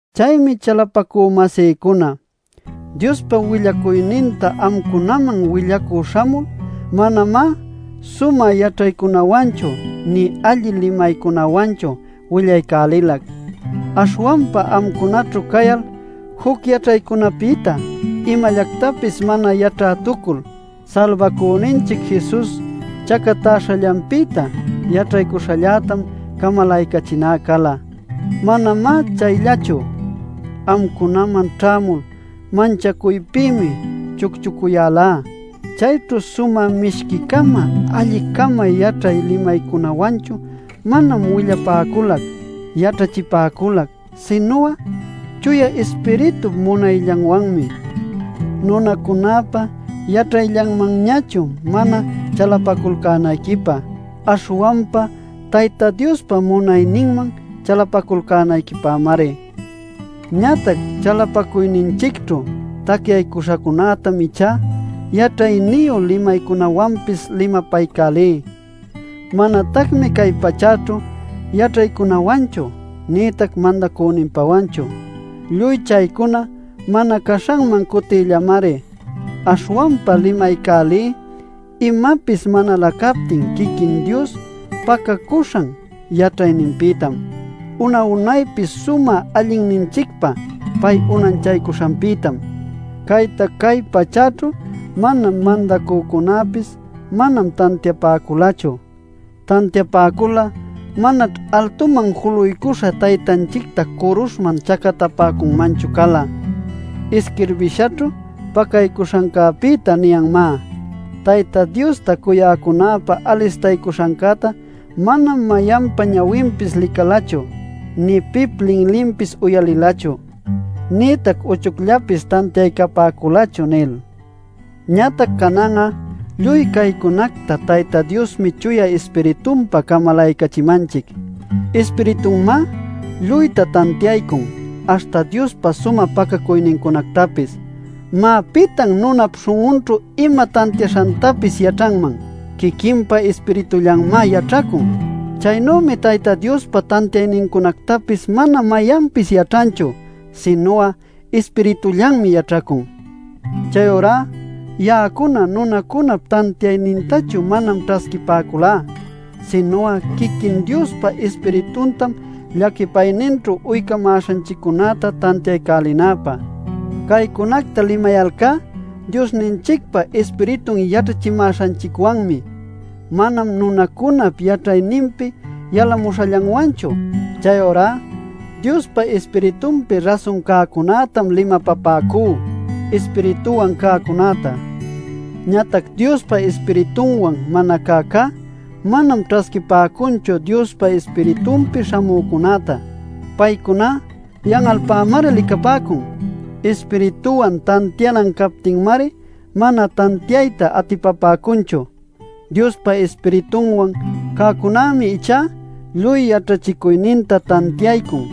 Chaymi chalapacü-masïcuna, Diospa willacuyninta amcunaman willacü śhamul manamá sumä yaćhaycunawanchu nï alli limaycunawanchu willaycälilac. Aśhwanpa amcunaćhu cayal juc yaćhaycunapïta imallactapis mana yaćhätucul, Salbacüninchic Jesus chacatäśhallanpïta yaćhaycuśhallätam camalaycachiná cala. Manamá chayllachu; amcunaman ćhämul manchacuypïmi chucchucuyälá. Chayćhu sumä mishqui-cama allin-cama yaćhay limaycunawanchu manam willapäculac, yaćhachipäculac, sinu'a Chuya Ispiritup munayllanwanmi, nunacunäpa yaćhayllanmanñachu mana chalapacuyalcänayquipä, aśhwanpa Tayta Diospa munayninman chalapacuyalcänayquipämari. Ñatac chalapacuyninchicćhu tacyaśhacunätam ichá yaćhayniyu limaycunawanpis limapaycälí. Manatacmi cay pachäćhu yaćhaycunawanchu nïtac mandacüninpawanchu. Lluy chaycuna mana caśhanman cutïllamari. Aśhwanpa limaycälí imapis manalä captin quiquin Dios pacaycuśhan yaćhayninpïtam, una-unaypi sumä allinninchicpä pay unanchaycuśhanpïtam. Cayta cay pachäćhu mayan mandacücunäpis manam tantiapäculachu. Tantiapäcul'a manaćh altuman juluycuśha Taytanchicta curuśhman chacatapäcunmanchu cala. Isquirbishaćhu pacaycuśhancäpïta niyanmá: “Tayta Diosta cuyäcunäpä alistaycuśhancäta manam mayanpa ñawinpis licalachu, nï pip linlinpis uyalilachu, nïtac uchucllapis tantiaycapäculachu” nil. Ñatac canan'a lluy caycunacta Tayta Diosmi Chuya Ispiritunpa camalaycachimanchic. Ispiritunmá lluyta tantiaycun, aśhta Diospa sumä pacacuynincunactapis. Má ¿pitan nunap śhun'unćhu ima tantiaśhantapis yaćhanman? Quiquinpa ispiritullanmá yaćhacun. Chaynümi Tayta Diospa tantiaynincunactapis mana mayanpis yaćhanchu, sinu'a Ispiritullanmi yaćhaycun. Chayurá ya'acuna nunacunap tantiaynintachu manam ćhasquipäculá, sinu'a quiquin Diospa Ispirituntam llaquipayninćhu uycamäśhanchiccunäta tantiaycälinäpä. Caycunacta limayalcá Diosninchicpa Ispiritun yaćhachimäśhanchicwanmi; manam nunacunap yaćhayninpi yalamuśhallanwanchu. Chayurá Diospa Ispiritunpi rasun cäcunätam limapapäcú Ispirituwan cäcunäta. Ñatac Diospa Ispiritunwan mana cäcá, manam ćhasquipäcunchu Diospa Ispiritunpi śhamücunätá. Paycuná yan'alpämari licapäcun. Ispirituwan tantianan captinmari mana tantiayta atipapäcunchu. Diospa Ispiritunwan cäcunämi ichá lluy yaćhachicuyninta tantiaycun;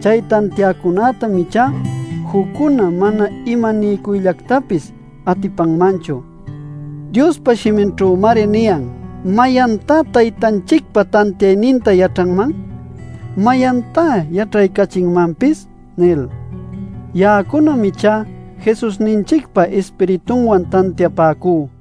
chay tantiäcunätam ichá juccuna mana imaniycuyllactapis atipanmanchu. Diospa shiminćhümari niyan: “¿Mayantá Taytanchicpa tantiayninta yaćhanman? ¿Mayantá yaćhaycachinmanpis?” nil. Ya'acunam ichá Jesusninchicpa Ispiritunwan tantiapäcú.